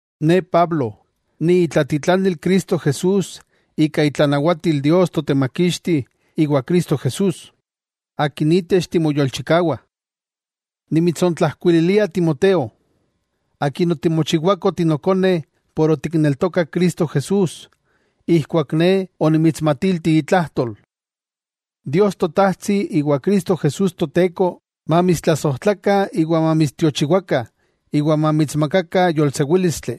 Ne Pablo, ni itlatitlanil Cristo Jesús ika itlanawatil Dios Totemakixti iwa Cristo Jesús, Akin itech timoyolchikawah. Nimitsontlajkuililia Timoteo, akin otimochiwako tinokone ken otikneltokak Cristo Jesús ijkuak ne onimitsmatilti itlajtol. Dios Totajtsi iwa Cristo Jesús Toteko mamitstlasojtlakah iwa mamitstiochiwakah iwa mamitsmakakah yolsewílistli.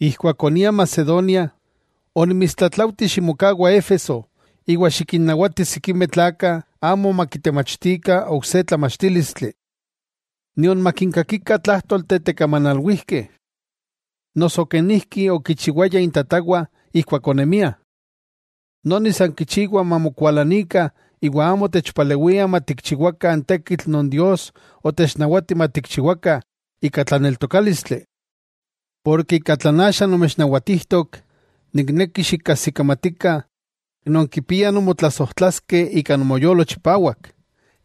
Ijkuak onia Macedonia, onimitstlatlaujti ximokawa Éfeso iwa xikinnawati sikimeh tlakah amo makitemachtikah ok se tlamachtílistli, nion makinkakikah tlájtolteh tekamanalwijkeh noso kenijki okichiwayah intatawah ijkuak onemiah. Noni san kichiwa mamokualanikah iwa amo techpalewiah matikchiwakah n tekitl non Dios otechnawati matikchiwakah ika tlaneltokálistli. Tlan axa nomechnawatijtok, nikneki xikajsikamatikah nonkipiah nonmotlasojtlaskeh ika nomoyolo chipawak,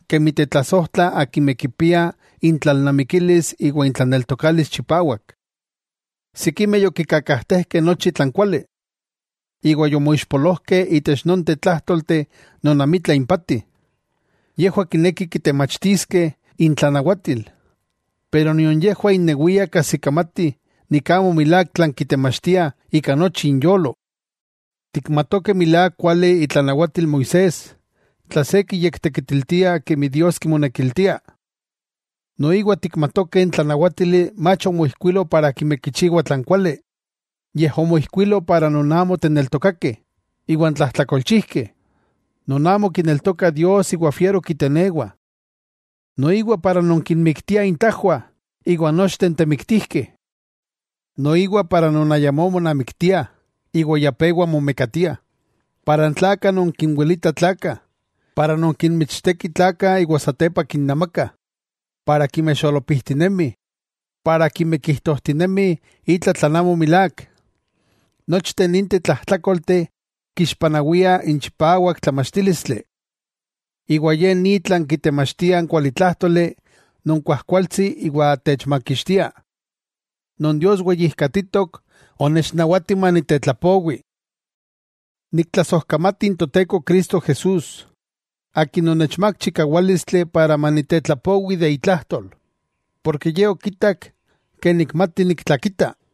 kemi tetlasojtlah akimeh kipiah intlalnamikilis iwa intlaneltokalis chipawak. Sikimeh yokikakajtejkeh nochi tlan kuali, iwa yomoixpolojkeh itech nonteh tlájtolteh non amitla impati. Yejwah kinekih kitemachtiskeh intlanawatil, pero nion yejwah innewiah kajsikamatih, amo milák tlan kitemachtiah ika nochi inyolo. Tikmatokeh milák kuali itlanawatil Moisés tla se kiyektekitiltia kemi Dios kimonekiltia. Noiwa tikmatokeh n tlanawátili mach omoijkuilo para akimeh kichiwah tlan kuali. Yej omoijkuilo para non amo teneltokakeh, iwa n tlajtlakolchijkeh, non amo kineltokah Dios iwa fiero kitenewah. Noiwa para non kinmiktiah intajwah, iwa nochteh n temiktijkeh, noiwa para non ayamó monamiktiah iwa ya pewa momekatiah, iwa n tlakah non kinwilitah tlakah, iwa n kinmichtekih tlakah iwa satepa kinnamakah, noiwa akimeh xolopijtinemih, akimeh kijtojtinemih itla tlan amo milák. Nochteh ninteh tlajtlákolteh kixpanawiah n chipawak tlamachtílistli. Ye ni tlan kitemachtia n kualitlájtoli non kuajkualtsi iwa techmakixtia, non Dios weyijkatitok onechnawati manitetlapowi. Niktlasojkamati n Toteko Cristo Jesús, Akin onechmák chikawálistli para manitetlapowi de itlajtol, porke Ye okitak nikmati niktlakita.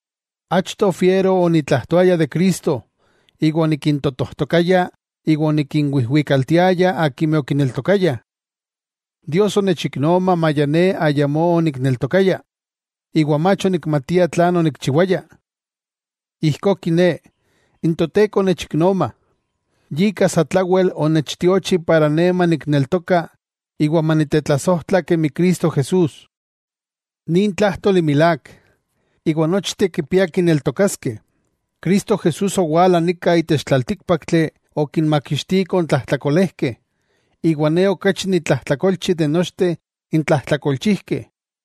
Achto fiero onitlajtoaya de Cristo iwa onikintotojtokaya iwa onikinwijwikaltiaya akimeh okineltokayah. Dios onechiknoma maya ne ayamó onikneltokaya, iwa mach onikmatia tlan onikchiwaya. Ijkó kiné, n Toteko onechiknoma, yika satlawel onechtiochi iwa ijkó manikneltoka iwa manitetlasojtla kemi Cristo Jesús. Nin tlájtoli milák, iwa nochteh kipiah kineltokaskeh: Cristo Jesús owala nika itech tlaltíkpaktli okinmakixtiko n tlajtlakolejkeh, iwa ne okachi nitlajtlakolchi de nochteh n tlajtlakolchijkeh.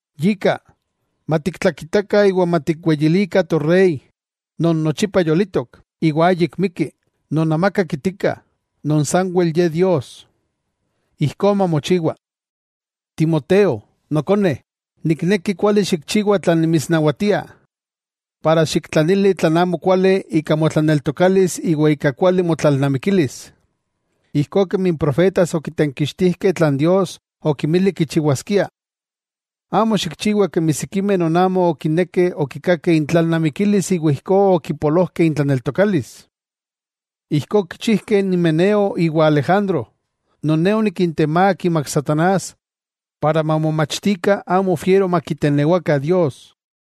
¡Yika, matiktlakitakah iwa matikweyilikah Torey non nochipa yolitok, iwa ayik miki, non amaka kitika, non sanwel Ye Dios! ¡Ijkó mamochiwa! Timoteo nokone, nikneki kuali xikchiwa tlan nimitsnawatia iwa xiktlanili tlan amokuali ika motlaneltokalis iwa ika kuali motlalnamikilis, ijkó kemi n profetas okitenkixtijkeh tlan Dios okinmili tikchiwaskia. Amo xikchiwa kemi sikimeh non amo okinekeh okikakeh intlalnamikilis iwa ijkó okipolojkeh itlaneltokalis. Ijkó okichijkeh n Himeneo iwa Alejandro, non ne onikintemák imak satanás para mamomachtikah amo fiero makitenewakah Dios.